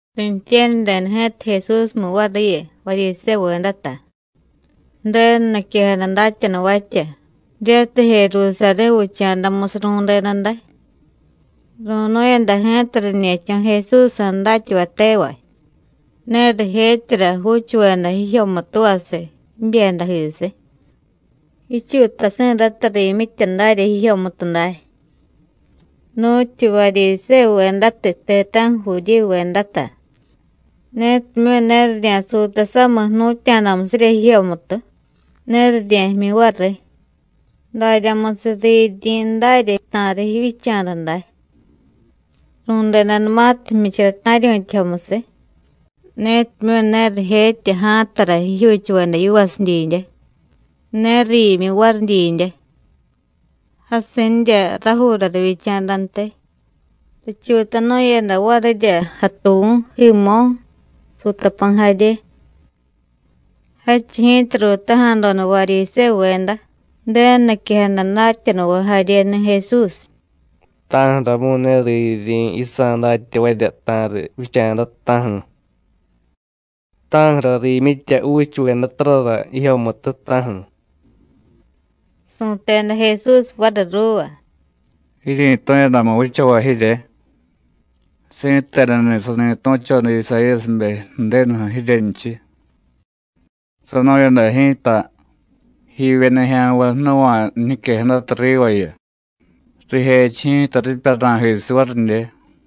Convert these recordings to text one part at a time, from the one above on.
Riintye̱ryadeda ji̱ta Jesúsmu variyu, Varyisévuvedata, Ju̱denu niquejada datyanuvatya, jiryatiy Jerusarí̱ vicha̱damusiy ru̱deda day. Ru̱nu̱yada ji̱ta riñe̱cho̱ Jesúsjsa̱ datyavay tevay, ne rijetyara juuchuveda jijyomutuvasiy jibyedajisiy, jichuutasi̱rata riimyitya darya jijyomutu day. (Nu̱tyu Varyisévuvedatiy, ti̱ta̱ju̱ Judíyuvedata, netimyu̱ ne rirya̱suuta samiy jnu̱tya̱damusirya jijyomutu, ne rirye̱jmyi variy, daryamusiy riiryiryi̱ darya ta̱riy jivyicha̱da day. Ru̱dedanumatiy jmyichara ta̱ryu̱tyajomusiy, netimyu̱ ne rijetya ja̱a̱tara jijyuuchuveda yivasidyidye, ne riimyi variy didye. Jasinrya rajuura rivyicha̱dantiy, richuutanu̱yada varirya jatuvu̱, jiimo̱, suutapa̱y jarye.) Jadchiy ji̱ta ruutaja̱doda Varyisévuveda, Ju̱denu niquejada datyanuvay jaryeni̱ Jesús: “¿Ta̱ju̱ramu̱y ne riiryiryi̱ yisa̱ datyavarya ta̱riy vicha̱da, ta̱ju̱? ¿Ta̱ju̱ra riimyitya juuchuvedatarara jijyomutu, ta̱ju̱?” Su̱teda Jesús variy ruuva: “Jiryi̱tu̱yadamu vichavay jirye. Si̱tenuni̱ sani tu̱choda Isayíyasibe Ju̱denuju̱ jiryenchiy. Sanu̱yada ji̱ta: Jivye nijya̱nvay jnuva̱y jiñiquejadata rivayu, rijechiy ji̱ta ripya ra̱jisiy varidye.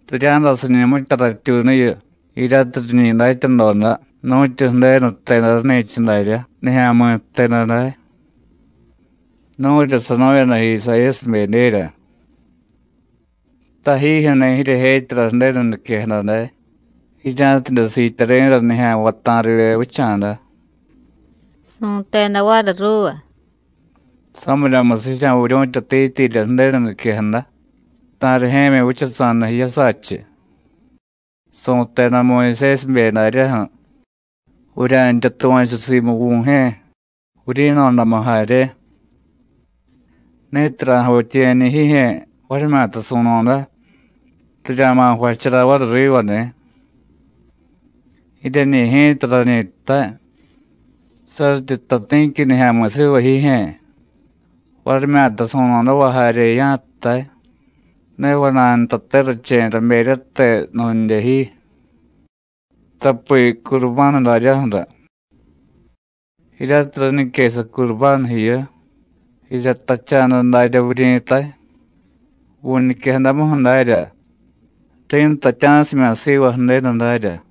Rirya̱dasiñu mitya ratyuunuyu jiryatiy riñi datyadoda nu̱tyu Ju̱denu jteda rani̱cha dárya nijya̱mi̱ jteda day. Nu̱rya sanu̱yada Isayíyasibedyerya. Tajijyu̱ni̱ jiryejetyara Ju̱denu niquejada day, jirya̱tidye siityari̱ra nijya̱nvay ta̱rivye vicha̱da.” Su̱teda variy ruuva: “Samiryamusiy jirya̱viryu̱tyatityirya Ju̱denu niquejada, ta̱rijye̱myi vichasa̱da jiyasachiy. Su̱teda Muyusésibe daryaju̱: Vurya̱ntya tuva̱chu simu vu̱jye̱, vuryi̱no̱damu jarye. Ni̱tiy ra̱javityiye̱ñi̱ jijye̱, varimyata su̱no̱da, rirya̱ma̱ jvachara variy riva ni̱. Jiryeñi̱ ji̱ta rañi jtay: Saryityi jtay ti̱qui nijya̱mi̱ siva jijye̱, varimyata su̱no̱dava jarye ya̱jtay: Ne vana̱y ntate rache̱y raberyate nu̱ndye ji, tapi Curubánu daryaju̱ra. (Jiryatiy raniquesa Curubánu jiyu, jirya jtacha̱da daryá vuryi̱tay vu̱ñiquejadamuju̱ darya: Ri̱ntatya̱simya̱ siva Ju̱denu darya.)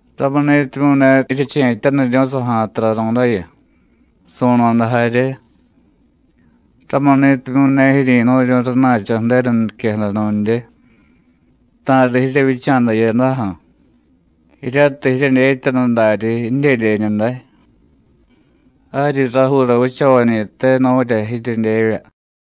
Ramuni̱timyu̱ ne jiryeche̱tyaniryu̱y saja̱y taranu̱dayu, su̱no̱da jarye. Ramuni̱timyu̱ ne jiryi̱nu̱ryu̱y rana̱cho̱ Ju̱denu niquejada nu̱ndye, ta̱riy jiryevyicha̱da jiyadaju̱, jiryatiy jiryedyetyanu daryi jidyedyeñu day. Jaryi rajuura vichavañi̱te nu̱rya jiryedyevya.”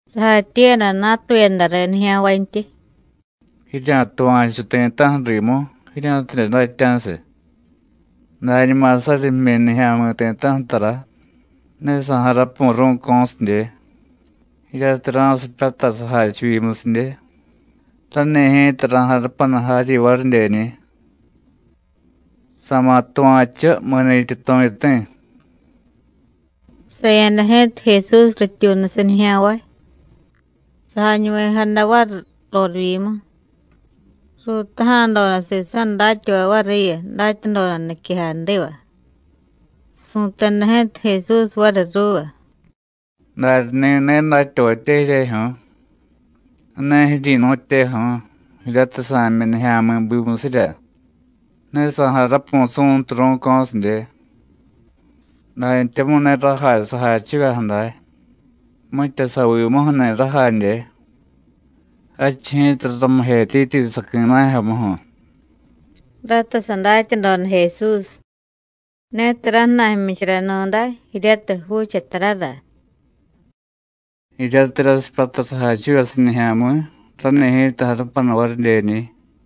Sajatyiiyada natuyada riy nijya̱nvantyi: “Jirya̱tuva̱chu ti̱ta̱ju̱ rimu, jirya̱tidye datya̱siy. Dañuma saryi jmyi nijya̱mi̱ ti̱ta̱ju̱ tara, ne sa̱jarapu̱y ru̱co̱sidye; jiryatiy ra̱sipyatay sajachivyimusidye, rani̱ ji̱ta ra̱jarupanu jaryi varidyeñi̱. Sa̱ma̱ tuva̱chu mi̱ni̱tyi tu̱yuti̱.” Saya̱da ji̱ta Jesús rityuunusiy nijya̱nvay, sajañuvejada variy rorivyimu. Ruutaja̱doda sisa̱ datyavay variyu, datyadoda niquejadiva. Su̱teda ji̱ta Jesús variy ruuva: “¿Daryani̱ ne datyavatye jiryejyu̱ú̱? ¿Ne jiryi̱nu̱tyeju̱u̱, jiryatiy sa̱jmyi nijya̱mi̱ bimusirya, ne sa̱jarapu̱y su̱ntu ru̱co̱sidye? Dantyamu̱y ne rajay sajachivyaju̱ day, mitya savimuju̱ni̱ rajadye, jadchiy ji̱ta raramijetyityi saqui̱najyomuju̱.” Rata sadatyadoda Jesús: “Ne tara jna̱y jmyicharanu̱day jiryatiy juuchatarara.” “Jiryatiy rasipyatay sajachivyasiy nijya̱mi̱, rani̱ ji̱ta jarupanu varidyeñi̱.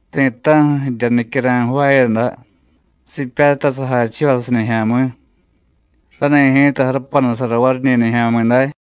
Ti̱ta̱ju̱ jirya nicyara̱y jvaayada sipyatay sajachivyasiy nijya̱mi̱, rani̱ ji̱ta jarupanusara variñi̱ nijya̱mi̱day.”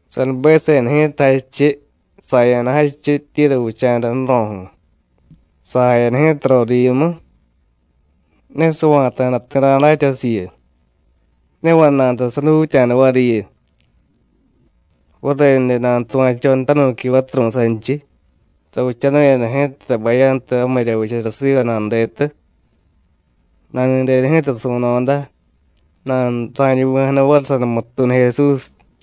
Sanubeseda ji̱ta jadchiy, saya̱da jadchiy Tíru vicha̱da ju̱ro̱ju̱. Sajayada ji̱ta rorivyimu, ne sava̱ta̱da ti̱ ra̱datya jasiyu. Ne vana̱y nta sadutya̱da variyu. Varenude nanutuva̱choda tanu̱qui vaturu̱y sanchiy. Savichanu̱yada ji̱ta bayantu jamirya vichara siva nanudetu. Nani̱deda ji̱ta su̱no̱da, nanura̱ñuvi̱jada variy sanumututuunu Jesús.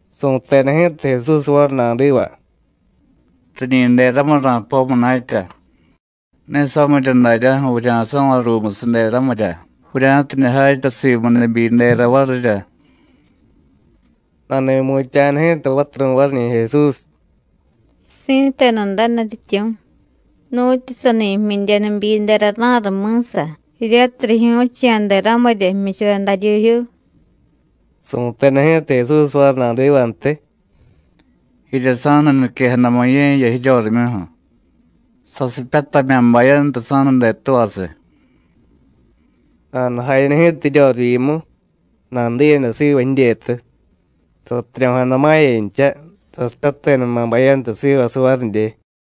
Su̱teda ji̱ta Jesús variy nadiva: “Riñi̱ deramiy ra̱poy munatya, ne samirya daryaju̱ vurya̱so̱vay ruumusiy deramirya, vurya̱tidye jatya simu nibyidera varirya.” Nani̱mutya̱jada ji̱ta vaturu̱y variñi̱ Jesús: “Si̱tenu day Nutyityu̱, nu̱tyu sani jmyidye nibyidera ra̱riy mi̱sa, jiryatiy rijyu̱chiya̱ deramirya jmyichara daryuujyuu.” Su̱teda ji̱ta Jesús variy nadivantiy: “Jirya sa̱nuniquejadamu ye̱jiya jiryorimyuju̱. Sasipyatamya̱ bayantu sa̱nudetuvasiy.” Nanujayada ji̱ta jiryorivyimu, nanudiyada siva jidyetu, satiryo̱jada ma̱yancha, sasipyatedama̱ bayantu sivasiy varidye.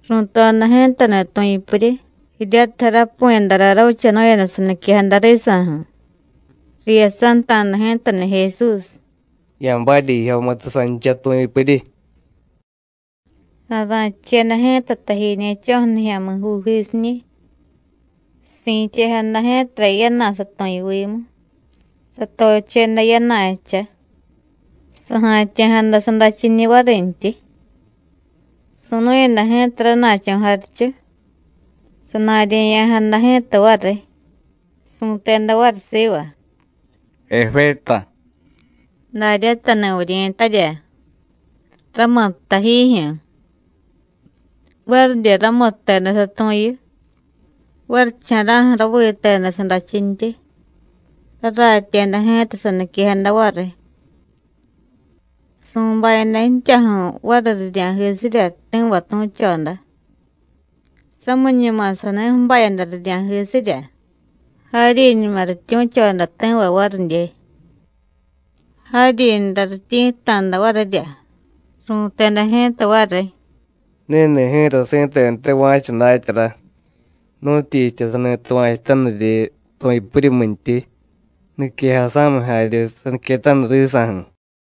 Ru̱toda ji̱tani̱ tu̱yupuryi jiryatiy jarapu̱yadara ravichanu̱yada saniquejada risa̱ju̱. Riyasanta̱da ji̱tani̱ Jesús: “Ya̱barya jijyomutu sancha tu̱yupuryi.” Sa̱ra̱cheda ji̱ta tajiñe̱cho̱ju̱ nijya̱mi̱juujisiñi̱, si̱tyejada ji̱tara yana̱ satu̱yuvimu, satocheda yana̱jcha, saja̱tya̱jada sadachiñiy varintyi. Su̱nu̱yada ji̱ta rana̱cho̱ jarichu, sana̱rye̱ya̱jada ji̱ta variy. Su̱teda variy siva: “Eféta,” daryatani̱ vuryi̱tarya: “Ra̱muttay jiijyu̱.” Varidye ramutteda satu̱yu, varicha̱ra̱ju̱ raviteda sadachintyi, raratyeda ji̱ta saniquejada variy. Su̱bayada ji̱tyaju̱ variy rirya̱jisirya ti̱va tu̱choda. Samiñuma sani ju̱bayada rirya̱jisirya, jaryiñuma rityu̱choda ti̱va varidye. Jaryinra rityi̱tta̱da varirya. Ru̱teda ji̱ta variy: “Ni̱ni̱ ji̱ta si̱tenute va̱cha datyara, nu̱tyichitya sani tuva̱chutaniryi tu̱yupuryimyintyi, niquejasa̱miy jarye saniquetaniy risa̱ju̱.”